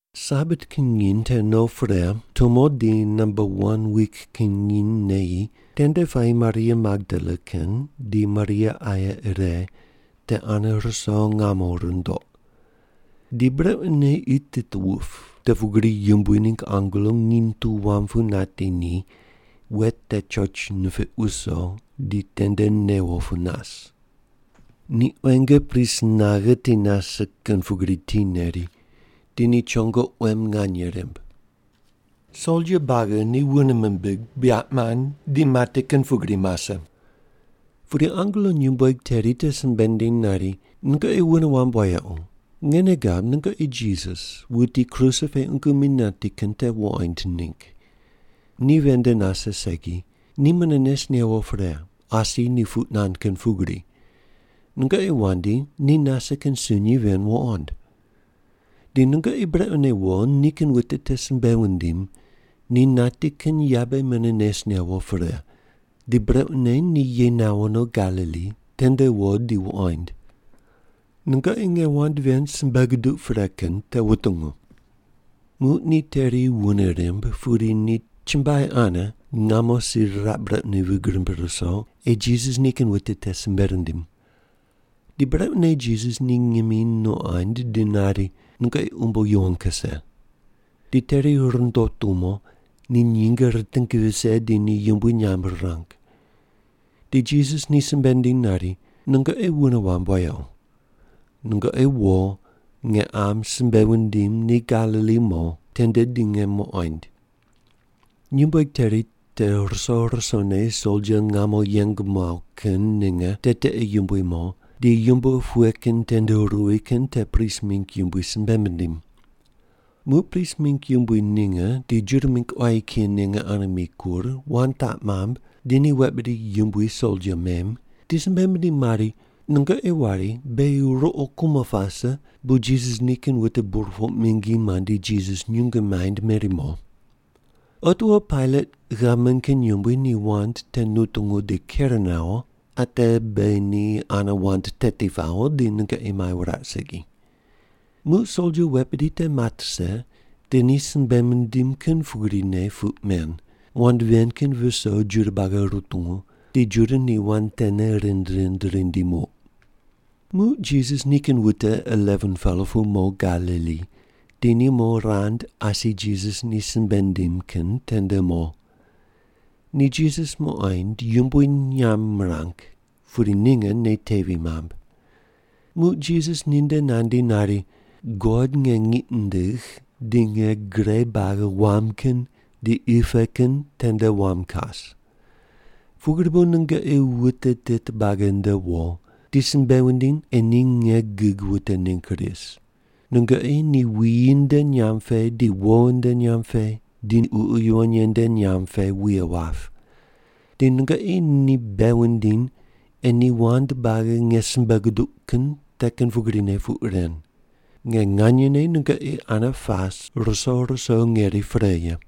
Sabat kin nginy te no pre, tumo di namba wan wik kin nginy neyi, tende puayi Maria Magdala kin di Maria aye ire te ane ruso ngamo rundoq. Di brequne qi tit wup, te pugri Yumbui ningg angelo nginy tu wam pu nati ni, wet te choch nipiq wuso, di tende newo pu nas. Ni quenge pris naghe ti nase kin pugri ti neri, di ni chongo quem nganye rimb. Soldia buagi ni wune mimbig, buyaq mand, di mati kin pugri mase. Pudi angelo nyumbueg teri te simbe nindiny nari, “Nungoqi wune wamb wayequ, nge nei gab nungoqi Jisas, wuti kruse pe qungu mi nati kin te wuqoind ningg. Ni ven nde nase segi, ni mune nes newo pre, asi ni puq nand kin pugri. Nungoqi wandi, ni nase kin sunyi ven wuqond. Di nungoqi brequne wo, nikin wute te simbe wundim, ‘Ni nati kin yabe mune nes newo pre, di brequne ni ye nawo no Galili, tende wo di wuqoind.’ Nungoqi nge wand ven simbe guduq pre kin te wutungu.” Muq ni teri wune rimb, pudi ni chumbuai ane ngamo si riraq brequne vig rimb ruso ei Jisas nikin wute te simbe rindim. Di brequne Jisas ni ngimi nuqond di nari, “Nungoqi umbo yuwon kuse.” Di teri rundo tumo, ni nyinge riting vise di ni yumbui nyamb rirang. Di Jisas ni simbe nindiny nari, “Nungoqi wune wamb wayequ. Nungoqi wo nge qam simbe wundim ni Galili mo, tende di nge muqoind.” Nyumbueg teri te ruso rusone soldia ngamo yeng muaw kin ninge te tiqe yumbui mo, di yumbo pughe kin tende ruwi kin te prist mingg yumbui simbe mindim. Muq prist mingg yumbui ninge di Juda mingg quayi kiyi ninge ane mikur, wand taq mamb di ni wet bidi yumbui soldia mem, di simbe mindim mari, “Nungoqi wari, ‘Beghi ruqo kumo pase bu Jisas nikin wute burpoq mingi mandi Jisas nyungu maind meri mo.’ Otiwo Pailat gavman kin yumbui ni wand te nutungu di ker nawo, ate beghi ni ane wand teti pawo di nungoqi mai wuraq segi.” Muq soldia wet bidi te mat rise, di ni simbe mindim kin pugrine puq men, wand ven kin viso Juda buagi rutungu, di Juda ni wand tene rind rind rindi muq. Muq Jisas nikin wute 11-pela pu mo Galili, di ni mo rand asi Jisas ni simbe nindim kin tende mo. Ni Jisas muqoind yumbui nyamb mirang, pudi ninge nei tevi mamb. Muq Jisas ninde nandi nari, “God nge ngiq nindigh di nge gre buagi wam kin di qi pe kin tende wam kas. Pugri bu nungoqi wute tit buagi nde wo, di simbe wundiny ei ni nge gig wute ningg ris. Nungoqi ni wuyi nde nyamb pe di wo nde nyamb pe di Ququ Yuwon Ye nde nyamb pe wuye wap. Di nungoqi ni bei wundiny ei ni wand buagi nge simbe guduq kin te kin pugrine puq ren. Nge nganyene nungoqi ane pas ruso ruso ngeri pre ye.”